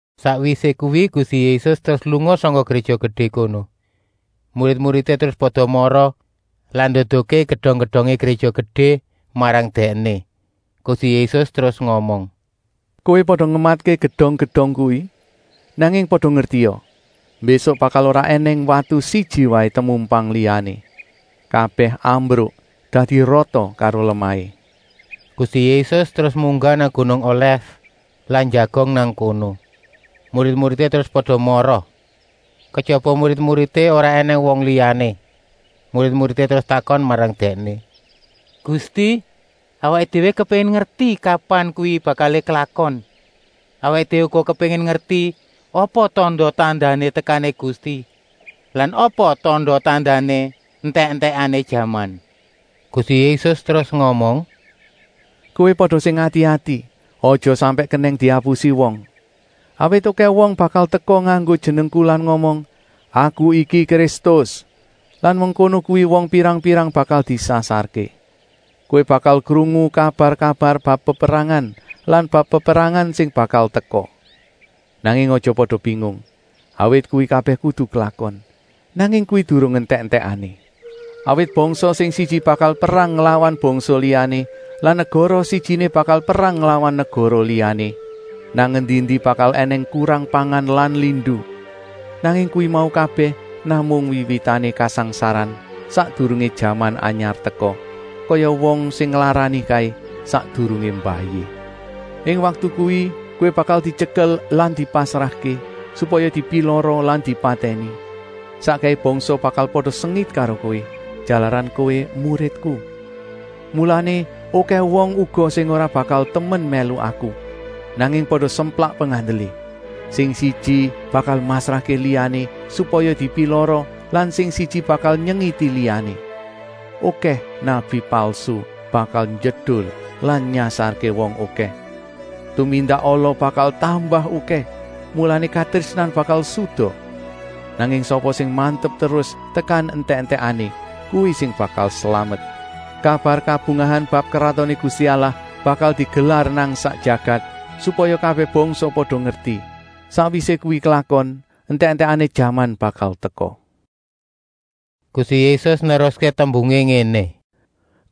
Sakwisé kuwi Gusti Yésus terus lunga sangka Gréja Gedé kono. Murid-muridé terus pada mara lan nduduhké gedong-gedongé Gréja Gedé marang Dèkné. Gusti Yésus terus ngomong: “Kowé pada ngematké gedong-gedong kuwi, nanging pada ngertia, mbésuk bakal ora ènèng watu siji waé temumpang liyané. Kabèh ambruk dadi rata karo lemahé.” Gusti Yésus terus munggah nang gunung Olèf lan njagong nang kono. Murid-muridé terus pada mara. Kejaba murid-muridé ora ènèng wong liyané. Murid-muridé terus takon marang Dèkné: “Gusti, awaké déwé kepéngin ngerti kapan kuwi bakalé klakon. Awaké déwé uga kepéngin ngerti apa tanda-tandané tekané Gusti lan apa tanda-tandané entèk-entèkané jaman?” Gusti Yésus terus ngomong: “Kowé pada sing ati-ati, aja sampèk kenèng diapusi wong. Awit okèh wong bakal teka nganggo jenengku lan ngomong: ‘Aku iki Kristus!’ Lan mengkono kuwi wong pirang-pirang bakal disasarké. Kowé bakal krungu kabar-kabar bab peperangan lan bab peperangan sing bakal teka. Nanging aja pada bingung, awit kuwi kabèh kudu klakon. Nanging kuwi durung entèk-entèkané. Awit bangsa sing siji bakal perang nglawan bangsa liyané lan negara sijiné bakal perang nglawan negara liyané. Nang endi-endi bakal ènèng kurang pangan lan lindu. Nanging kuwi mau kabèh namung wiwitané kasangsaran sakdurungé jaman anyar teka, kaya wong sing nglarani kaé, sakdurungé mbayi. “Ing waktu kuwi kowé bakal dityekel lan dipasrahké, supaya dipilara lan dipatèni. Sakkèhé bangsa bakal pada sengit karo kowé, jalaran kowé muridku. Mulané okèh wong uga sing ora bakal temen mèlu Aku, nanging pada semplak pengandelé. Sing siji bakal masrahké liyané supaya dipilara lan sing siji bakal nyengiti liyané. Okèh nabi palsu bakal njedul lan nyasarké wong okèh. Tumindak ala bakal tambah okèh, mulané katrésnan bakal suda. Nanging sapa sing mantep terus tekan entèk-entèkané, kuwi sing bakal slamet. Kabar kabungahan bab Kratoné Gusti Allah bakal digelar nang sak jagat, supaya kabèh bangsa pada ngerti. Sakwisé kuwi klakon, entèk-entèkané jaman bakal teka.” Gusti Yésus neruské tembungé ngéné: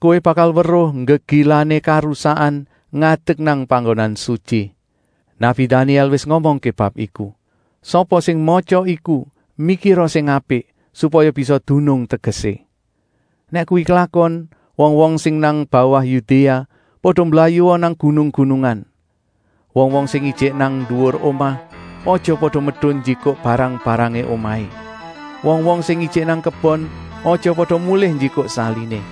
“Kowé bakal weruh Nggegilané Karusakan ngadek nang panggonan sutyi. Nabi Danièl wis ngomongké bab iku. Sapa sing matya iku mikira sing apik, supaya bisa dunung tegesé. Nèk kuwi klakon, wong-wong sing nang bawah Yudéa pada mblayua nang gunung-gunungan. Wong-wong sing ijik nang nduwur omah, aja pada medun njikuk barang-barangé omahé. Wong-wong sing ijik nang kebon, aja pada mulih njikuk saliné.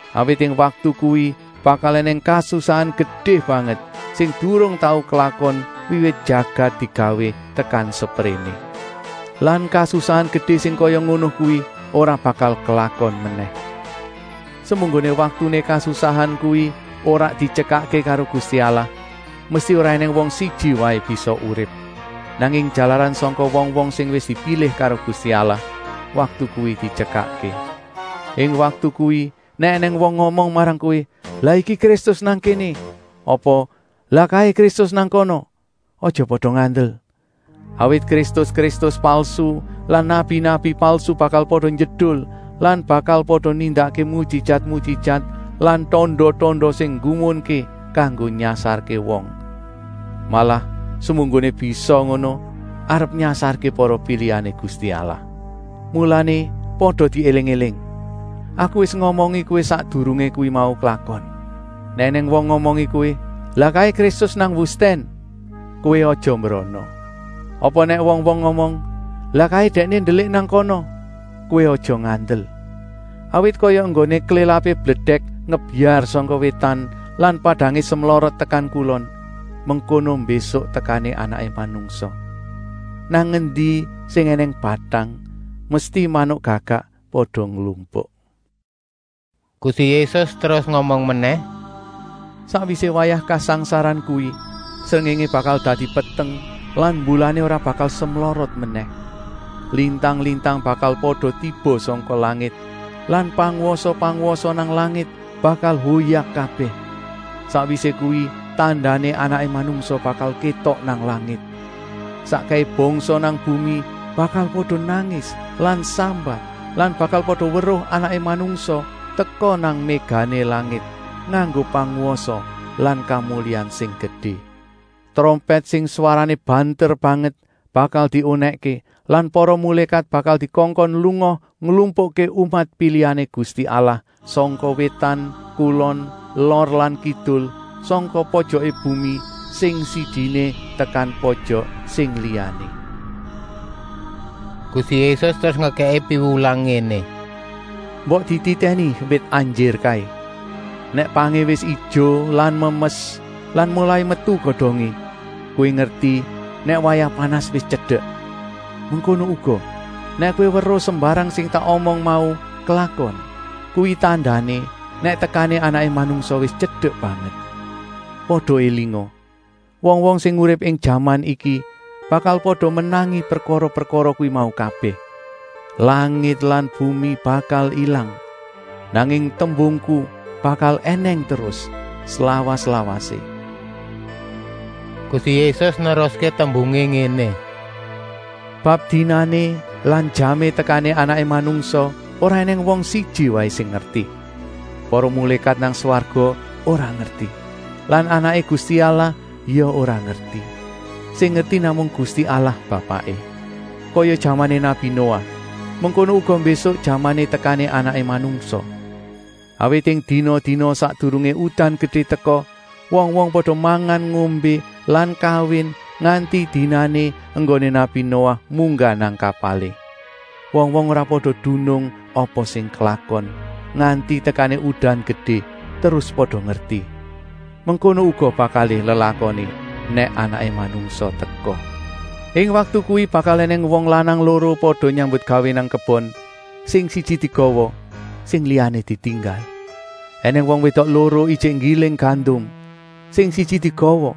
Awit ing waktu kuwi bakal ènèng kasusahan gedé banget, sing durung tau klakon wiwit jagat digawé tekan sepréné. Lan kasusahan gedé sing kaya ngono kuwi ora bakal klakon menèh. Semunggoné waktuné kasusahan kuwi ora dityekakké karo Gusti Allah, mesti ora ènèng wong siji waé bisa urip. Nanging jalaran sangka wong-wong sing wis dipilih karo Gusti Allah, waktu kuwi dityekakké. “Ing waktu kuwi, nèk ènèng wong ngomong marang kowé: ‘Lah iki Kristus nang kéné,’ apa ‘Lah kaé Kristus nang kana,’ aja pada ngandel. Awit kristus-kristus palsu lan nabi-nabi palsu bakal pada njedul lan bakal pada nindakké mujijat-mujijat lan tanda-tanda sing nggumunké kanggo nyasarké wong. Malah semunggoné bisa ngono arep nyasarké para pilihané Gusti Allah. Mulané pada diéling-éling! Aku wis ngomongi kowé sakdurungé kuwi mau klakon. “Nèk ènèng wong ngomongi kowé: ‘Lah kaé Kristus nang wustèn,’ kowé aja mbrana. Apa nèk wong-wong ngomong: ‘Lah kaé Dèkné ndelik nang kana,’ kowé aja ngandel. Awit kaya enggoné klélapé bledèk ngebyar sangka wétan lan padangé semlorot tekan kulon, mengkono mbésuk tekané Anaké Manungsa. “Nang endi sing ènèng batang, mesti manuk gagak pada nglumpuk.” Gusti Yésus terus ngomong menèh: “Sakwisé wayah kasangsaran kuwi, srengéngé bakal dadi peteng lan mbulané ora bakal semlorot menèh. Lintang-lintang bakal pada tiba sangka langit lan pangwasa-pangwasa nang langit bakal hoyak kabèh. Sakwisé kuwi tandané Anaké Manungsa bakal kétok nang langit. Sakkèhé bangsa nang bumi bakal pada nangis lan sambat lan bakal pada weruh Anaké Manungsa teka nang mégané langit, nganggo pangwasa lan kamulyan sing gedé. Trompèt sing swarané banter banget bakal diunèkké lan para mulékat bakal dikongkon lunga nglumpukké umat pilihané Gusti Allah sangka wétan, kulon, lor lan kidul, sangka pojoké bumi sing sijiné tekan pojok sing liyané.” Gusti Yésus terus ngekèki piwulang ngéné: “Mbok dititèni wit anjir kaé. Nèk pangé wis ijo lan memes lan molai metu godongé, kowé ngerti nèk wayah panas wis tyedek. Mengkono uga, nèk kowé weruh sembarang sing tak omong mau klakon, kuwi tandané nèk tekané Anaké Manungsa wis tyedek banget. Pada élinga! Wong-wong sing urip ing jaman iki bakal pada menangi prekara-prekara kuwi mau kabèh. Langit lan bumi bakal ilang, nanging tembungku bakal ènèng terus slawas-lawasé.” Gusti Yésus neruské tembungé ngéné: “Bab dinané lan jamé tekané Anaké Manungsa ora ènèng wong siji waé sing ngerti. Para mulékat nang swarga ora ngerti lan Anaké Gusti Allah ya ora ngerti. Sing ngerti namung Gusti Allah Bapaké. Kaya jamané nabi Noah, mengkono uga mbésuk jamané tekané Anaké Manungsa. Awit ing dina-dina sakdurungé udan gedé teka, wong-wong pada mangan-ngombé lan kawin, nganti dinané enggoné nabi Noah munggah nang kapalé. Wong-wong ora pada dunung apa sing klakon, nganti tekané udan gedé, terus pada ngerti. Mengkono uga bakalé lelakoné nèk Anaké Manungsa teka. Ing waktu kuwi bakal ènèng wong lanang loro pada nyambutgawé nang kebon, sing siji digawa, sing liyané ditinggal. Enèng wong wédok loro ijik nggiling gandum, sing siji digawa,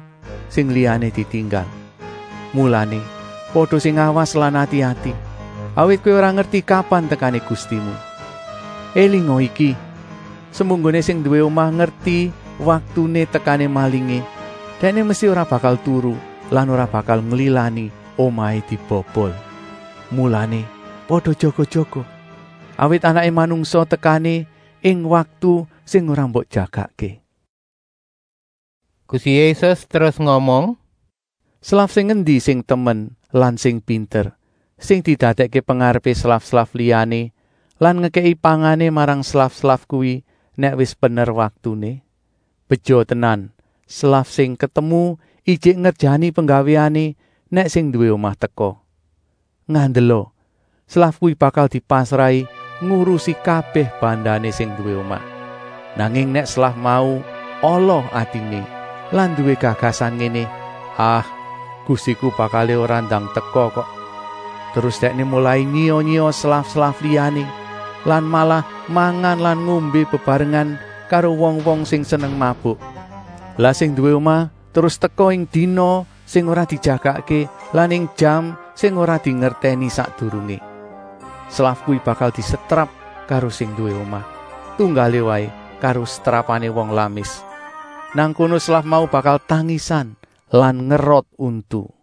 sing liyané ditinggal. “Mulané, pada sing awas lan ati-ati, awit kowé ora ngerti kapan tekané Gustimu. Elinga iki, semunggoné sing nduwé omah ngerti waktuné tekané malingé, dèkné mesti ora bakal turu lan ora bakal nglilani omahé dibobol. Mulané pada jaga-jaga, awit Anaké Manungsa tekané ing waktu sing ora mbok jagakké.” Gusti Yésus terus ngomong: “Slaf sing endi sing temen lan sing pinter, sing didadèkké pengarepé slaf-slaf liyané lan ngekèki pangané marang slaf-slaf kuwi nèk wis pener waktuné? Beja tenan slaf sing ketemu ijik ngerjani penggawéané nèk sing nduwé omah teka. Ngandela, slaf kuwi bakal dipasrahi ngurusi kabèh bandané sing nduwé omah. Nanging nèk slaf mau ala atiné lan nduwé gagasan ngéné: ‘Ah, gustiku bakalé ora ndang teka kok,’ terus dèkné molai nyiya-nyiya slaf-slaf liyané lan malah mangan lan ngombé bebarengan karo wong-wong sing seneng mabuk. Lah sing nduwé omah terus teka ing dina sing ora dijagakké lan ing jam sing ora dingertèni sakdurungé. Slaf kuwi bakal disetrap karo sing nduwé omah, tunggalé waé karo setrapané wong lamis. Nang kono slaf mau bakal tangisan lan ngerot untu.”